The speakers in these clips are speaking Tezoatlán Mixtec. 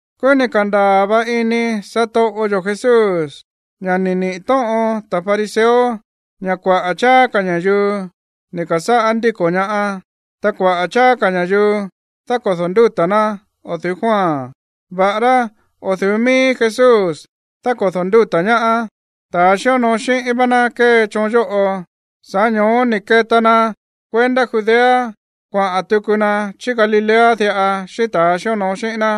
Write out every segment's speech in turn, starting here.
Kúú ni̱ ka̱ndaa̱ va ini satoꞌo yo̱ Jesús ña̱ ni̱ niꞌi̱ tóꞌon ta̱ fariseo ña̱ kuaꞌa̱ cháá ka̱ ña̱yuu ni̱ ka̱sáꞌá ndíko̱ ñaá, ta kuaꞌa̱ cháá ka̱ ña̱yuu dákodo̱ ndúta̱ ná o̱ du̱ú Juan, va̱ꞌará o̱ du̱ú mií Jesús dákodo̱ ndúta̱ ñaá, ta̱ xíonoo xíꞌín vá ná kée choon yóꞌo. Sa̱ꞌá ño̱ó ni̱ keta na kuendá Judea kuaꞌa̱n tuku na chí Galilea diꞌa xíꞌín ta̱a xíonoo xíꞌín ná.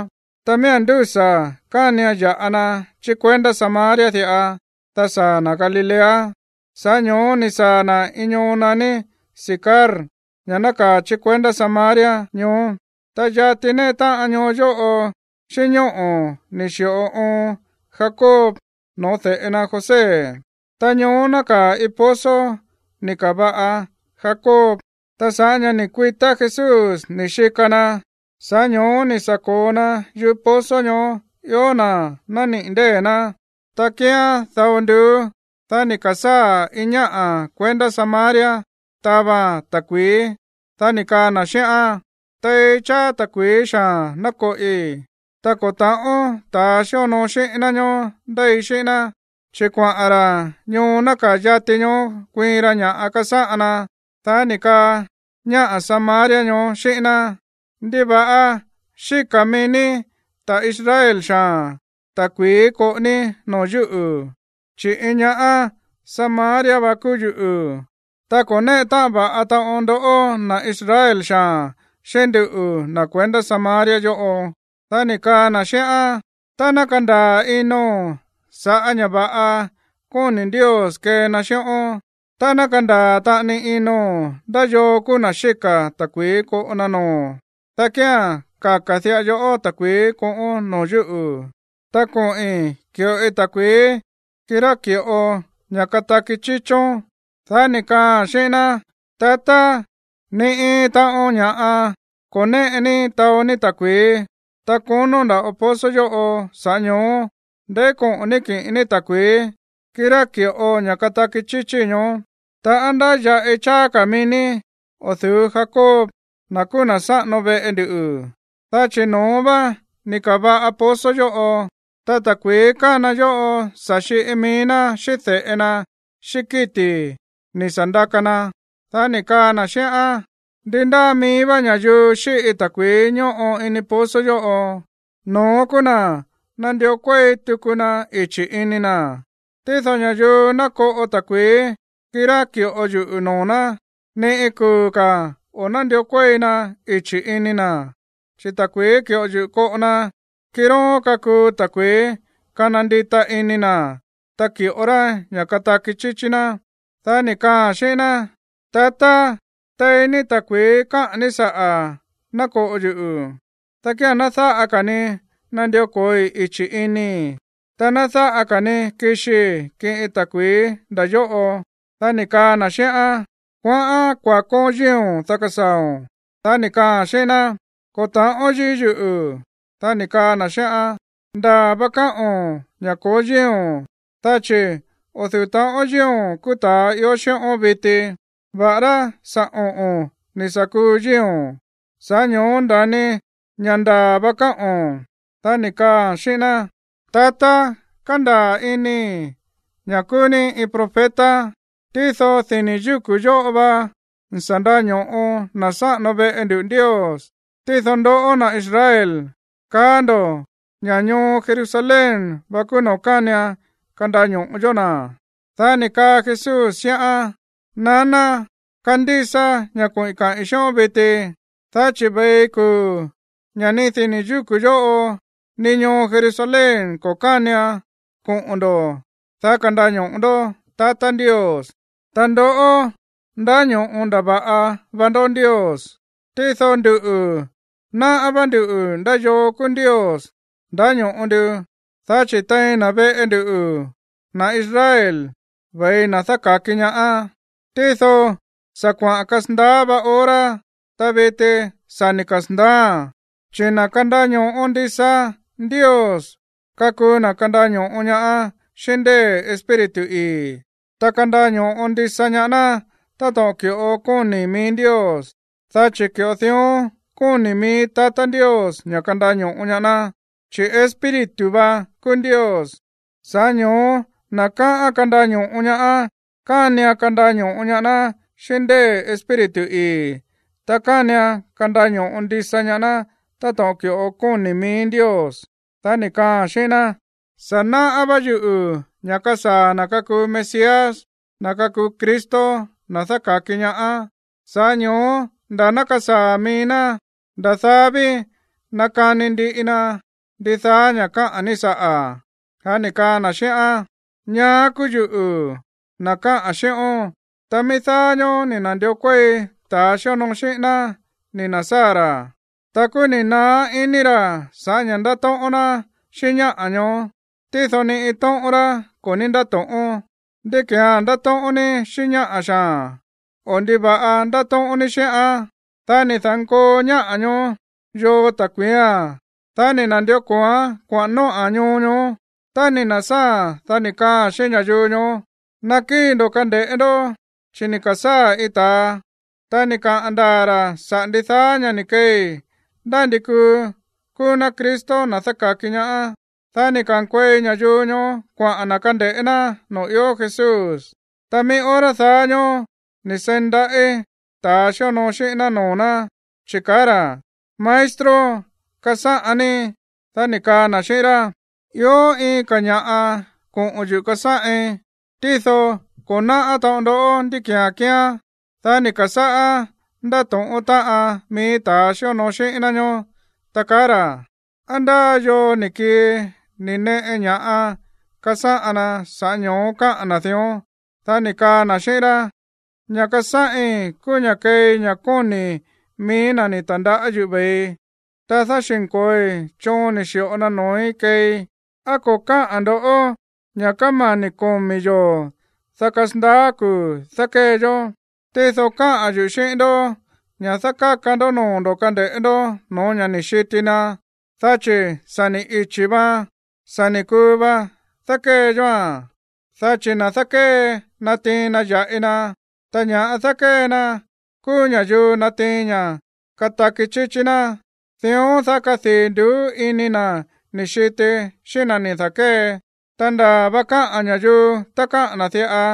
Ta miía̱n ndúsa̱ kánian ya̱ꞌa na chí kuendá Samaria diꞌa, dá saa̱ na̱ Galilea. Sa̱ꞌá ño̱ó ni̱ saa̱ na̱ iin ñoo naní Sicar, ña̱ nákaa̱ chí Samaria ñoó. Ta yati néꞌe táꞌan ñoo yóꞌo xíꞌín ñóꞌo̱ ni̱ xi̱ꞌo oon Jacob no̱ó de̱ꞌe na José. Ta ñoó nákaa̱ iin pozo ni̱ ka̱va̱ꞌa Jacob. Ta sa̱ꞌá ña̱ ni̱ kuitá Jesús ni̱ xika na, sa̱ꞌá ño̱ó ni̱ sa̱ ko̱o na yúꞌu̱ pozo ñoó ió na̱ nániꞌi̱ ndée̱ ná. Ta kíán dao nduú. Dá ni̱ ka̱sáa̱ iin ñáꞌa̱ kuendá Samaria taváa̱n ta̱kui̱í, dá ni̱ kaa na̱ xíꞌán: ―Tei cháá ta̱kui̱í xaa̱n ná koꞌi. Ta ko̱ ta̱ꞌón ta̱ xíonoo xíꞌín ná ñoó ndéi xíꞌín ná, chi̱ kuaꞌa̱n ra̱ ñoo nákaa̱ yati ñoó kuiin ra ña̱ꞌa kasáꞌan na. Dá ni̱ kaa ñáꞌa̱ Samaria ñoó xíꞌín ná: ―¿Ndiva̱ꞌa xíka̱ mií ní, ta̱ Israel xaa̱n, ta̱kui̱í koꞌo ní noo̱ yúꞌu̱, chi̱ iin ñá Samaria va kúú yuꞌu̱? Ta ko̱ néꞌe táꞌan va̱ꞌa taꞌon ndoꞌó, na̱ Israel xaa̱n, xíꞌín nduꞌu̱, na̱ kuendá Samaria yóꞌo. Dá ni̱ kaa na̱ xíꞌán: ―Tá ná kandaa̱ ino̱n sa̱ꞌá ña̱ va̱ꞌa kóni̱ Ndios kee na xíꞌón, ta ná kandaa̱ taꞌani ino̱n ndá yoo kúú na̱ xíka̱ ta̱kui̱í koꞌo na noo̱o̱n, dá kía̱n kaka̱ diꞌa yoꞌó ta̱kui̱í koꞌón noo̱ yúꞌu̱, ta koꞌi̱n ki̱ꞌoi ta̱kui̱í, kirá ki̱ꞌo ña̱ kataki chíchón. Dá ni̱ kaaa̱n xíꞌín ná: ―Tatá, ni iin taꞌon ña̱ꞌa ko̱ néꞌe ní taó ní ta̱kui̱í, ta konó nda̱ꞌo pozo yóꞌo. Sa̱ꞌá ño̱ó, ¿ndeí koꞌo̱n ní kiꞌin ní ta̱kui̱í, kirá ki̱ꞌo ña̱ kataki chíchí ñoó? Ta, ¿á ndáya̱ꞌi cháá ka̱ mií ní o̱ du̱ú Jacob, na̱ kúú na̱ sáꞌano veꞌe ndu? Dá chi̱ no̱ón vá ni̱ ka̱va̱ꞌa pozo yóꞌo, ta ta̱kui̱í kána yóꞌo sa̱ xiꞌi mií ná, xíꞌín de̱ꞌe na xíꞌín kíti̱ ni̱ sa̱ ndaka na. Dá ni̱ kaa na̱ xíꞌán: ―Ndi ndáa mií vá ña̱yuu xíꞌi ta̱kui̱í ñóꞌo ini pozo yóꞌo, no̱ón kúú na̱ nandió kuéi tuku na ichi̱ ini na̱. Tído ña̱yuu ná koꞌo ta̱kui̱í, kirá ki̱ꞌo yuꞌu̱ noo̱ ná, ni iin kuu̱ ka̱ o̱ nándió kuéi na ichi̱ ini na̱. Chi̱ ta̱kui̱í ki̱ꞌo yuꞌu̱ koꞌo na, kiróón kakuu ta̱kui̱í kana ndita ini na̱, ta ki̱ꞌo ra ña̱ kataki chíchí ná. Dá ni̱ kaaa̱n xíꞌín ná: ―Tatá, tei ní ta̱kui̱í káꞌa̱n ní saꞌa̱ ná koꞌo yuꞌu̱, dá kía̱n ná dáꞌa ka̱ ni nandió ko̱oi ichi̱ inii̱, ta ná dáꞌa ka̱ ni kixii kiꞌin ta̱kui̱í nda̱ yóꞌo. Dá ni̱ kaa na̱ xíꞌán: ―Kuaꞌán kuakón yíi̱o̱n, dá kasaa̱o̱n. Dá ni̱ kaaa̱n xíꞌín ná: ―Ko̱ ta̱ꞌón yíi̱ yuꞌu̱. Dá ni̱ kaa na̱ xíꞌán: ―Ndaa̱ va káꞌo̱n ña̱ ko̱ó yíi̱o̱n, dá chi̱ o̱ du̱ú ta̱ꞌón yíi̱o̱n kúú ta̱a ió xíꞌón viti, va̱ꞌará sa̱ oꞌo̱n ni̱ sa̱ kuu yíi̱o̱n. Sa̱ꞌá ño̱ó nda̱ni ña̱ ndaa̱ va káꞌo̱n. Dá ni̱ kaaa̱n xíꞌín ná: ―Tatá, kándaa̱ inii̱ ña̱ kúú ní iin profeta. Tído dini̱ yúku̱ yóꞌo va ni̱ sa̱ nda̱ño̱ꞌo na̱ sáꞌano veꞌe nduꞌu̱ Ndios, tído ndoꞌó, na̱ Israel, kaá ndo̱ ña̱ ñoo Jerusalén va kúú noo̱ kánian kandaño̱ꞌo yó na̱. Dá ni̱ kaa Jesús xíꞌán: ―Naná, kandísa ña̱ koꞌi̱n kaꞌi̱n xíꞌón viti, dá chi̱ ve̱i kuu̱ ña̱ ni dini̱ yúku̱ yóꞌo, ni ñoo Jerusalén ko̱ kánian koꞌo̱n ndo̱, dá kandaño̱ꞌo ndó tatá Ndios. Ta ndoꞌó, ndáño̱ꞌo ndava̱ꞌa va ndó Ndios, tído nduꞌu̱, náꞌá vá nduꞌu̱ ndá yoo kúú Ndios ndáño̱ꞌo ndu, dá chi̱ tein na̱ veꞌe nduꞌu̱, na̱ Israel, ve̱i na̱ dáka̱ki ñaá. Tído sa̱ kuaꞌa̱n kasandaá vá hora, ta viti sa̱ ni̱ kasa̱ndaáa̱n, chi̱ na̱ kandaño̱ꞌo ndisa Ndios kakuu na̱ kandaño̱ꞌo ñaá xíꞌín ndée̱ Espíritu ii̱, ta kandaño̱ꞌo ndisa ñaá ná táto̱ꞌon ki̱ꞌo kóni̱ mií Ndios, dá chi̱ ki̱ꞌo dión kóni̱ mií tatá Ndios ña̱ kandaño̱ꞌo ñaá ná. Chi̱ Espíritu vá kúú Ndios. Sa̱ꞌá ño̱ó na̱ kaꞌán kandaño̱ꞌo ñaá, kánian kandaño̱ꞌo ñaá ná xíꞌín ndée̱ Espíritu ii̱, ta kánian kandaño̱ꞌo ndisa ñaá ná táto̱ꞌon ki̱ꞌo kóni̱ mií Ndios. Dá ni̱ kaaa̱n xíꞌín ná: ―Sa̱ náꞌá vá yuꞌu̱ ña̱ kasaa̱ na̱ kakuu Mesías, na̱ kakuu Cristo, na̱ dáka̱ki ñaá. Sa̱ꞌá ño̱ó nda̱ ná kasaa̱ mií ná, nda̱ daá ví nakani ndiꞌi na ndidaá ña̱ káꞌa̱n ní saꞌa̱. Dá ni̱ kaa na̱ xíꞌán: ―Ñaá kúú yuꞌu̱, na̱ káꞌa̱n xíꞌón. Ta mií dáá ñóó ni̱ na̱ndió kuéi ta̱ xíonoo xíꞌín ná ni̱ na̱sáa̱ ra̱, ta kúú ni̱ naá ini ra̱ sa̱ꞌá ña̱ ndátóꞌón ná xíꞌín ñáꞌa̱ ñoó. Tído ni iin tóꞌón rá ko̱ ní ndáto̱ꞌón: “¿Ndí ki̱án ndátóꞌón ní xíꞌín ñáꞌa̱ xaa̱n?” o “¿Ndiva̱ꞌa ndátóꞌón ní xíꞌán?” Dá ni̱ da̱nkoo ñáꞌa̱ ñoó yoo ta̱kui̱ía̱n, dá ni̱ na̱ndió ko̱oán kuaꞌa̱n nóꞌa̱n ñoo ñoó. Tá ni̱ na̱sáa̱a̱n, dá ni̱ kaaa̱n xíꞌín ña̱yuu ñoó: ―Nakíi̱ ndo̱ kande̱ꞌé ndó, chi̱ ni̱ ka̱sáa̱ iin ta̱a, ta ni̱ kaꞌa̱n ndaa̱ ra̱ saꞌa̱ ndidaá ña̱ ni̱ keei. Ndá ndi kuu kúú ná Cristo, na̱ dáka̱ki ñaá. Dá ni̱ ka̱nkuei ñayuu ñoó kuaꞌa̱n na̱ kande̱ꞌé ná noo̱ ió Jesús. Ta mií hora daá ñóó ni̱ seí ndaꞌí ta̱ xíonoo xíꞌín ná noo̱ ná, chi̱ kaá ra̱: ―Maestro, kasáꞌan ní. Dá ni̱ kaa na̱ xíꞌín rá: ―Ió iin ka̱ ña̱ꞌa koꞌo̱n yuꞌu̱ kasáꞌin, tído ko̱ náꞌá taꞌon ndó ndí ki̱án kíán. Dá ni̱ ka̱sáꞌá ndáto̱ꞌón táꞌan mií ta̱ xíonoo xíꞌín ná ñoó, ta kaá ra̱: ―¿Á ndá yoo ni̱ kii ni̱ neꞌe ña̱ꞌa kasáꞌan na, sa̱ꞌá ño̱ó káꞌa̱n na̱ dión? Dá ni̱ kaa na̱ xíꞌín rá: ―Ña̱ꞌa kasáꞌin kúú ña̱ kéei ña̱ kóni̱ mií na̱ ni̱ ta̱ndaꞌá yuꞌu̱ ve̱ii, ta dáxi̱nko̱oi choon ni̱ xi̱ꞌo na noo̱í keei. ¿Á ko̱ káꞌa̱n ndo̱ ña̱ kámani̱ komi̱ yoo̱, dá kasandaá kuu̱ dákée yó? Tído káꞌa̱n yuꞌu̱ xíꞌín ndó ña̱ dákáka noo̱ ndo̱ kande̱ꞌé ndó no̱ó ña̱ ni̱ xiti na, dá chi̱ sa̱ ni̱ ichi̱ vaan, sa̱ ni̱ kuu va dákée yóa̱n. Dá chi̱ na̱ dákée natiin na ya̱ꞌi na, ta ña̱ dákée na kúú ña̱yuu natiin ña̱ kataki chíchí ná. Dión, dá kadii̱ nduú ini na̱ ni̱ xiti xíꞌín na̱ ni̱ da̱kée. Ta ndaa̱ va káꞌa̱n ña̱yuu tá káꞌa̱n na̱ diꞌa: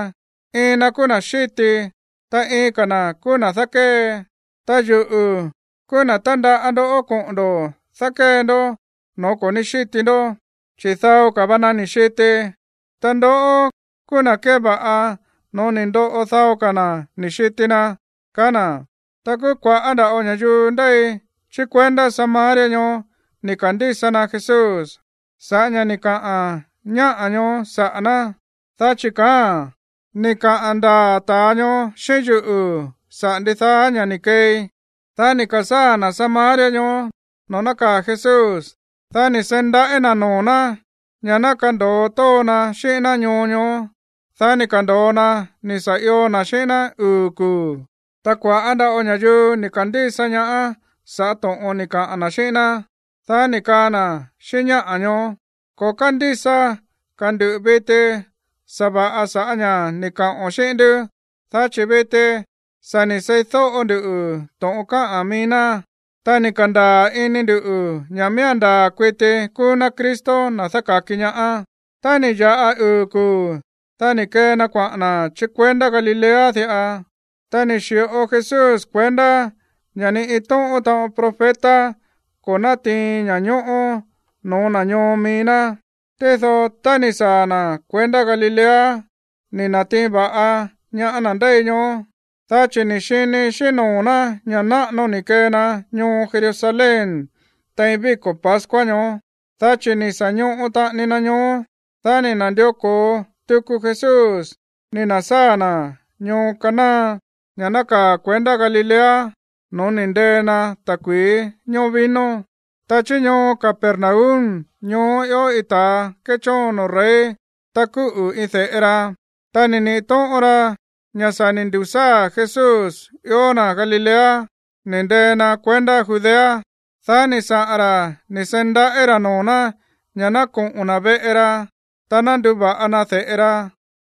“Iin na̱ kúú na̱ xíti, ta iin ka̱ na̱ kúú na̱ dákée.” Ta yuꞌu̱ kúú na̱ tandaꞌá ndoꞌó koꞌo̱n ndo̱ dákée ndó no̱ó ko̱ ní xíti ndó, chi̱ dao ka̱ va na ni̱ xiti, ta ndoꞌó kúú na̱ keva̱ꞌa no̱ó ni̱ ndoꞌo dao ka̱ na̱ ni̱ xiti na ―kaá na̱. Ta kúú kua̱ꞌá nda̱ꞌo ña̱yuu ndéi chí kuendá Samaria ñoó ni̱ ka̱ndísa na Jesús sa̱ꞌá ña̱ ni̱ kaꞌa̱n ñáꞌa̱ ñoó saꞌa̱ ná, dá chi̱ kaáa̱n: “Ni̱ kaꞌa̱n ndaa̱ ta̱a ñoó xíꞌín yuꞌu̱ saꞌa̱ ndidaá ña̱ꞌa ni̱ keei.” Dá ni̱ ka̱sáa̱ na̱ Samaria ñoó noo̱ nákaa̱ Jesús, dá ni̱ seí ndaꞌí na̱ noo̱ ná ña̱ ná kando̱o tóó na xíꞌín ná ñoo ñoó. Dá ni̱ ka̱ndo̱o na ni̱ sa̱ io na̱ xíꞌín ná uu̱ kuu̱. Ta kua̱ꞌá nda̱ꞌo ña̱yuu ni̱ ka̱ndísa ñaá sa̱ꞌá to̱ꞌon ni̱ kaꞌa̱n na̱ xíꞌín ná, dá ni̱ kaa na̱ xíꞌín ñáꞌa̱ ñoó: ―Ko̱ kándísa ka̱ ndu̱ viti sa̱va̱ꞌa sa̱ꞌá ña̱ ni̱ kaꞌo̱n xíꞌín ndú, dá chi̱ viti sa̱ ni̱ seídóꞌo ndu to̱ꞌon káꞌa̱n mií ná. Ta ni̱ ka̱ndaa̱ ini ndu̱ ña̱ miía̱n ndaa̱ kuiti kúú ná Cristo, na̱ dáka̱ki ñaá. Tá ni̱ ya̱ꞌa uu̱ kuu̱, dá ni̱ kee na kuaꞌa̱n na̱ chí kuendá Galilea diꞌa. Ta ni̱ xi̱ꞌo Jesús kuendá ña̱ ni iin tóꞌón taꞌon profeta ko̱ nátiin ña̱ñóꞌó noo̱ na̱ ñoo mií ná. Tído tá ni̱ saa̱ na̱ kuendá Galilea, ni̱ na̱tiin va̱ꞌa ñaá na̱ ndéi ñoó, dá chi̱ ni̱ xini xíꞌín noo̱ ná ña̱ náꞌano ni̱ kee na ñoo Jerusalén tein víko̱ pascua ñoó, dá chi̱ ni̱ sa̱ ñoꞌo taꞌani na ñoó. Dá ni̱ na̱ndió ko̱o tuku Jesús ni̱ na̱sáa̱ na̱ ñoo Caná, ña̱ nákaa̱ kuendá Galilea no̱ó ni̱ ndee na ta̱kui̱í ñoó vino. Ta chí ñoo Capernaum ñoó ió iin ta̱ kéchóon noo̱ rey, ta kúꞌu̱ iin de̱ꞌe ra. Tá ni̱ niꞌi̱ tóꞌon ra ña̱ sa̱ ni̱ ndu̱sáa̱ Jesús ió na̱ Galilea, ni̱ ndee na kuendá Judea, dá ni̱ saꞌa̱n ra̱ ni̱ seí ndaꞌí ra̱ noo̱ ná ña̱ ná koꞌo̱n na̱ veꞌe ra, ta ná nduva̱ꞌa na de̱ꞌe ra,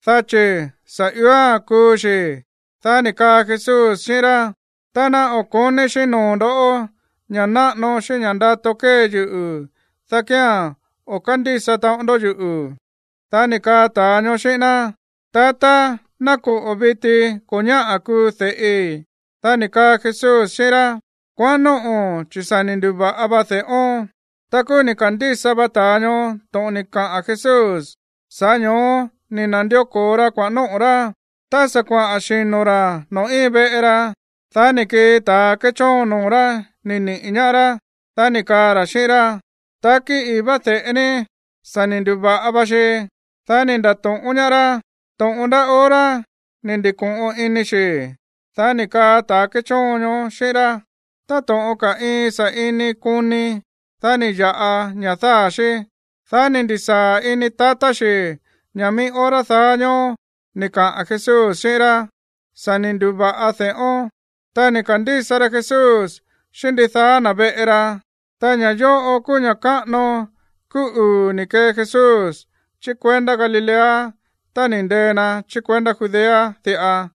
dá chi̱ sa̱ ióa̱n kuu xi̱. Dá ni̱ kaa Jesús xíꞌín rá: ―Tá ná o̱ ko̱ní xíꞌín noo̱ ndo̱ ña̱ náꞌano xíꞌín ña̱ ndato kée yuꞌu̱, dá kía̱n o̱ kándísa taꞌon ndó yuꞌu̱. Dá ni̱ kaa ta̱a ñoó xíꞌín ná: ―Tatá, ná koꞌo̱ viti ko̱ ñáꞌa̱ kuu de̱ꞌi. Dá ni̱ kaa Jesús xíꞌín rá: ―Kuaꞌán nóꞌo̱n, chi̱ sa̱ ni̱ ndu̱va̱ꞌa va de̱ꞌón. Ta kúú ni̱ ka̱ndísa va ta̱a ñoó to̱ꞌon ni̱ kaꞌa̱n Jesús. Sa̱ꞌá ño̱ó ni̱ na̱ndió ko̱o ra kuaꞌa̱n nóꞌo̱ rá. Tá sa̱ kuaꞌa̱n xino̱ ra̱ noo̱ íin veꞌe ra, dá ni̱ kii ta̱ kéchóon noo̱ rá ni̱ niꞌi̱ ñaá rá. Dá ni̱ kaa ra̱ xíꞌín rá: ―Takí ii̱ vá de̱ꞌe ní, sa̱ ni̱ ndu̱va̱ꞌa va xi. Dá ni̱ nda̱to̱ꞌón ñaá rá to̱ꞌon ndá hora ni̱ ndi̱ko̱ꞌon ini xi̱. Dá ni̱ kaa ta̱ kéchóon ñoó xíꞌín rá: ―Táto̱ꞌon ka̱ iin sa̱ꞌini koni, dá ni̱ ya̱ꞌa ña̱ dáa̱ xí. Dá ni̱ ndi̱sáa̱ ini tatá xi̱ ña̱ mií hora daá ñóó ni̱ kaꞌa̱n Jesús xíꞌín rá: “Sa̱ ni̱ ndu̱va̱ꞌa de̱ꞌón.” Ta ni̱ ka̱ndísa rá Jesús, xíꞌín ndidaá na̱ veꞌe ra. Ta ña̱ yóꞌo kúú ña̱ káꞌano kúú uu̱ ni̱ kee Jesús chí kuendá Galilea tá ni̱ ndee na chí kuendá Judea diꞌa.